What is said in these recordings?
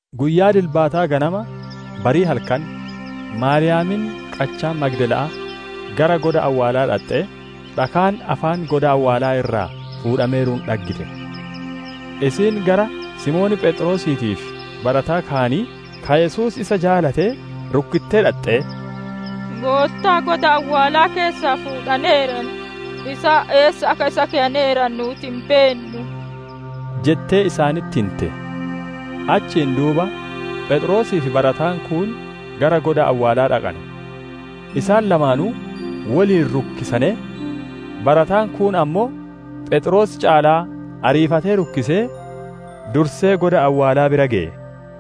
Guyyaa dilbataa ganama, barii halkan, Maariyaamiin qachaa Magdala'aa gara goda awwaalaa dhaxxee, dhakaan afaan goda awwaalaa irraa fuudhameeruun dhaggite. Isiin gara Simoon Pheexroosiitii fi barataa kaanii, ka Yesuus isa jaalatee, rukkittee dhaxxee, «Goottaa goda awwaalaa keessaa fuudhaneeran; isaan eessa akka isa keyaneeranu nuuti hin beennu» jettee isaanitti hinte. Achiin duuba Pheexroosii fi barataan kuun gara goda awwaalaa dhaqane. Isaan lamaanuu woliin rukkisanee, barataan kuun ammoo Pheexroos caalaa ariifatee rukkisee, dursee goda awwaalaa bira geye.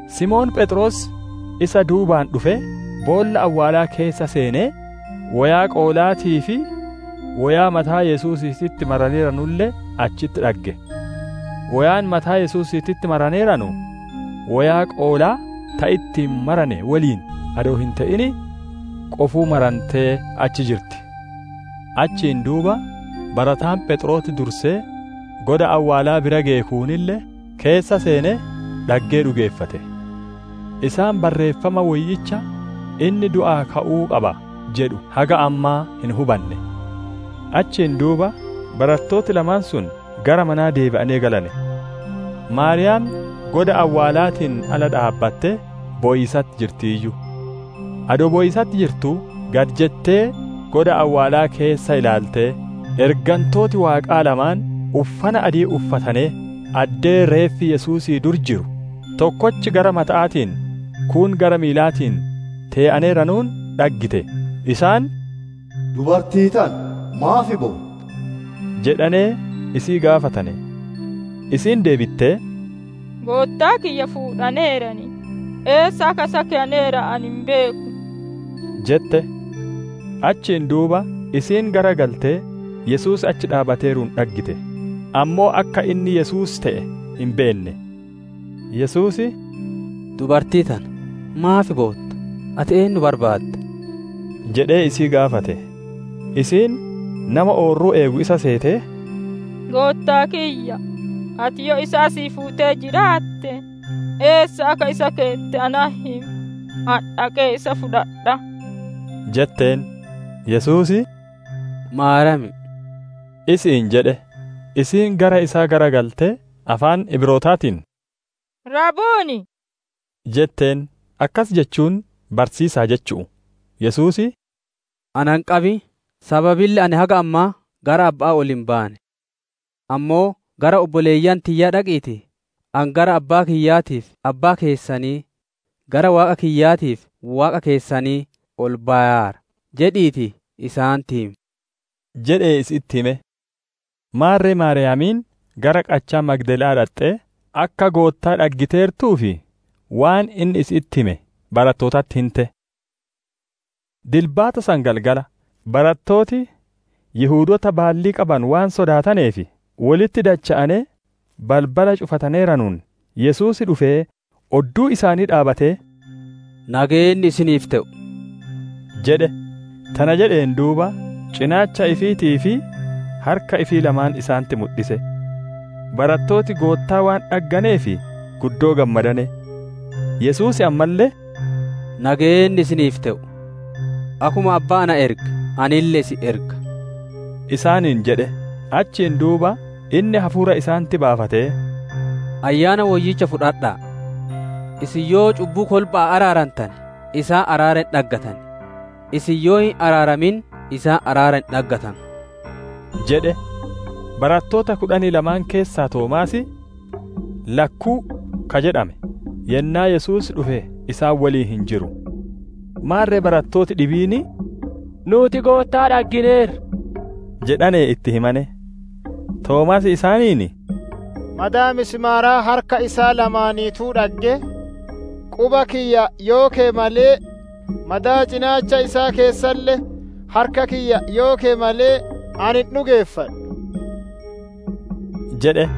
Simoon Pheexroos isa duubaan dhufee, boolla awwaalaa keessa seenee, woyaa qoolaatii fi woyaa mataa Yesuusiititti maraneeranulle achitti dhagge. Woyaan mataa Yesuusiititti maraneeranu, woyaa qoolaa ta ittiin marane woliin adoo hin te'in qofuu marantee achi jirti. Achiin duuba barataan Pheexroos dursee goda awwaalaa bira geye kuunille, keessa seenee, dhaggee dhugeeffate. Isaan Barreeffama Woyyicha, «Inni du'aa ka'uu qaba» jedhu haga ammaa hin hubanne. Achiin duuba barattooti lamaan sun gara manaa deebi'anee galane. Maariyaam goda awwaalaatiin ala dhaabbattee bowiisatti jirtiiyyu. Adoo bowiisatti jirtuu, gad jettee goda awwaalaa keessa ilaaltee, ergantooti Waaqaa lamaan uffana adii uffatanee, addee reeffi Yesuusii dur jiru, tokkochi gara mata'aatiin, kuun gara miilaatiin tee'aneeranuun dhaggite. Isaan, «Dubartii tana, maaf bootta?» jedhanee isii gaafatane. Isiin deebittee, «Goottaa kiyya fuudhaneeran; eessa akka isa keyaneeranu ani hin beeku!» jette. Achiin duuba isiin garagaltee Yesuus achi dhaabbateeruun dhaggite; ammoo akka inni Yesuus te'e hin beenne. Yesuus, «Dubartii tana, maaf bootta? Ati eennu barbaadda?» jedhee isii gaafate. Isiin, nama oorruu eegu isa seetee, «Goottaa kiyya, ati yoo isa asii fuutee jiraatte, eessa akka isa keette natti himi, ani dhaqee isa fudhadhaa» jetteen. Yesuus, «Maariyaam» isi'iin jedhe. Isiin gara isaa garagaltee afaan Ibrootaatiin, «Rabbunii» jetteen; akkas jechuun, «Barsiisaa» jechu'u. Yesuus, «Ana hin qabin! Sababille ani haga ammaa gara Abba'aa ol hin baane. Ammoo gara obboleeyyan tiyyaa dhaqiitii, ‹Ani gara Abbaa kiyyaatii fi Abbaa keessanii, gara Waaqa kiyyaatii fi Waaqa keessanii ol bayaara› jedhiitii isaanitti himi!» jedhee isi'itti hime. Maarre Maariyaamiin gara qachaa Magdala'aa dhaxxee akka Goottaa dhaggiteertuu fi waan inni isi'itti hime barattootatti hinte. Dilbata san galgala, barattooti Yihudoota baallii qabanu waan sodaataneef, wolitti dacha'anee balbala cufataneeranuun, Yesuus dhufee odduu isaanii dhaabbatee, «Nageenni isiniif te'u!» jedhe. Tana jedheen duuba, cinaacha ifiitii fi harka ifii lamaan isaanitti mudhise. Barattooti Goottaa waan dhagganeef guddoo gammadane. Yesuus ammalle, «Nageenni isiniif te'u. Akkuma Abbaan na erge, anille isin erga» isaaniin jedhe. Achiin duuba inni hafuura isaanitti baafatee, «Ayyaana Woyyicha fudhadha'a! Isin yoo cubbuu kolba'aa araarantane, isaan araara hin dhaggatan; isin yoo hin araaramin, isaan araara hin dhaggatanu» jedhe. Barattoota kudhanii lamaan keessaa, Toomaas, «Lakkuu» ka jedhame, yennaa Yesuus dhufe isaan woliin hin jiru. Maarre barattooti dhibiin, «Nuuti Goottaa dhaggineerra!» jedhanee itti himane. Toomaas isaaniin, «Madaa misimaaraa harka isaa lamaaniituu dhaggee, quba kiyya yoo keye malee, madaa cinaacha isaa keessalle harka kiyya yoo keye malee, ani hin dhugeeffadhu» jedhe.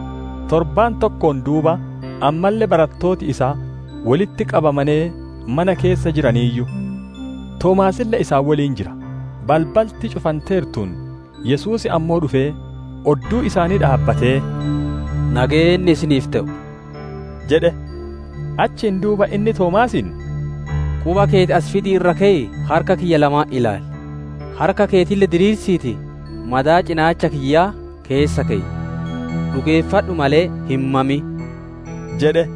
Torbaan tokkoon duuba ammalle barattooti isaa wolitti qabamanee mana keessa jiraniiyyu; Toomaasille isaan woliin jira. Balbalti cufanteertuun, Yesuus ammoo dhufee odduu isaanii dhaabbatee, «Nageenni isiniif te'u» jedhe. Achiin duuba inni Toomaasiin, «Quba keeti as fidii irra keyii, harka kiyya lamaan ilaali; harka keetille diriirsiitii madaa cinaacha kiyyaa keessa keyi. Dhugeeffadhu malee, hin mamin!» jedhe.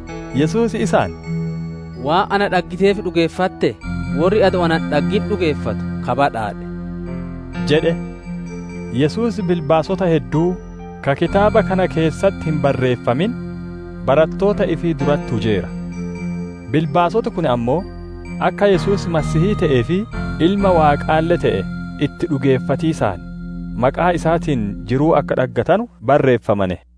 Yesuus isaan, «Waan na dhaggiteef dhugeeffattee? Worri adoo ana hin dhaggin dhugeeffatu ka badhaadhe!» jedhe. Yesuus bilbaasota hedduu, ka kitaaba kana keessatti hin barreeffamin, barattoota ifii duratti hujeera. Bilbaasoti kun ammoo akka Yesuus Masiihii te'ee fi Ilma Waaqaalle te'e, itti dhugeeffatiisaan maqaa isaatiin jiruu akka dhaggattanu barreeffamane.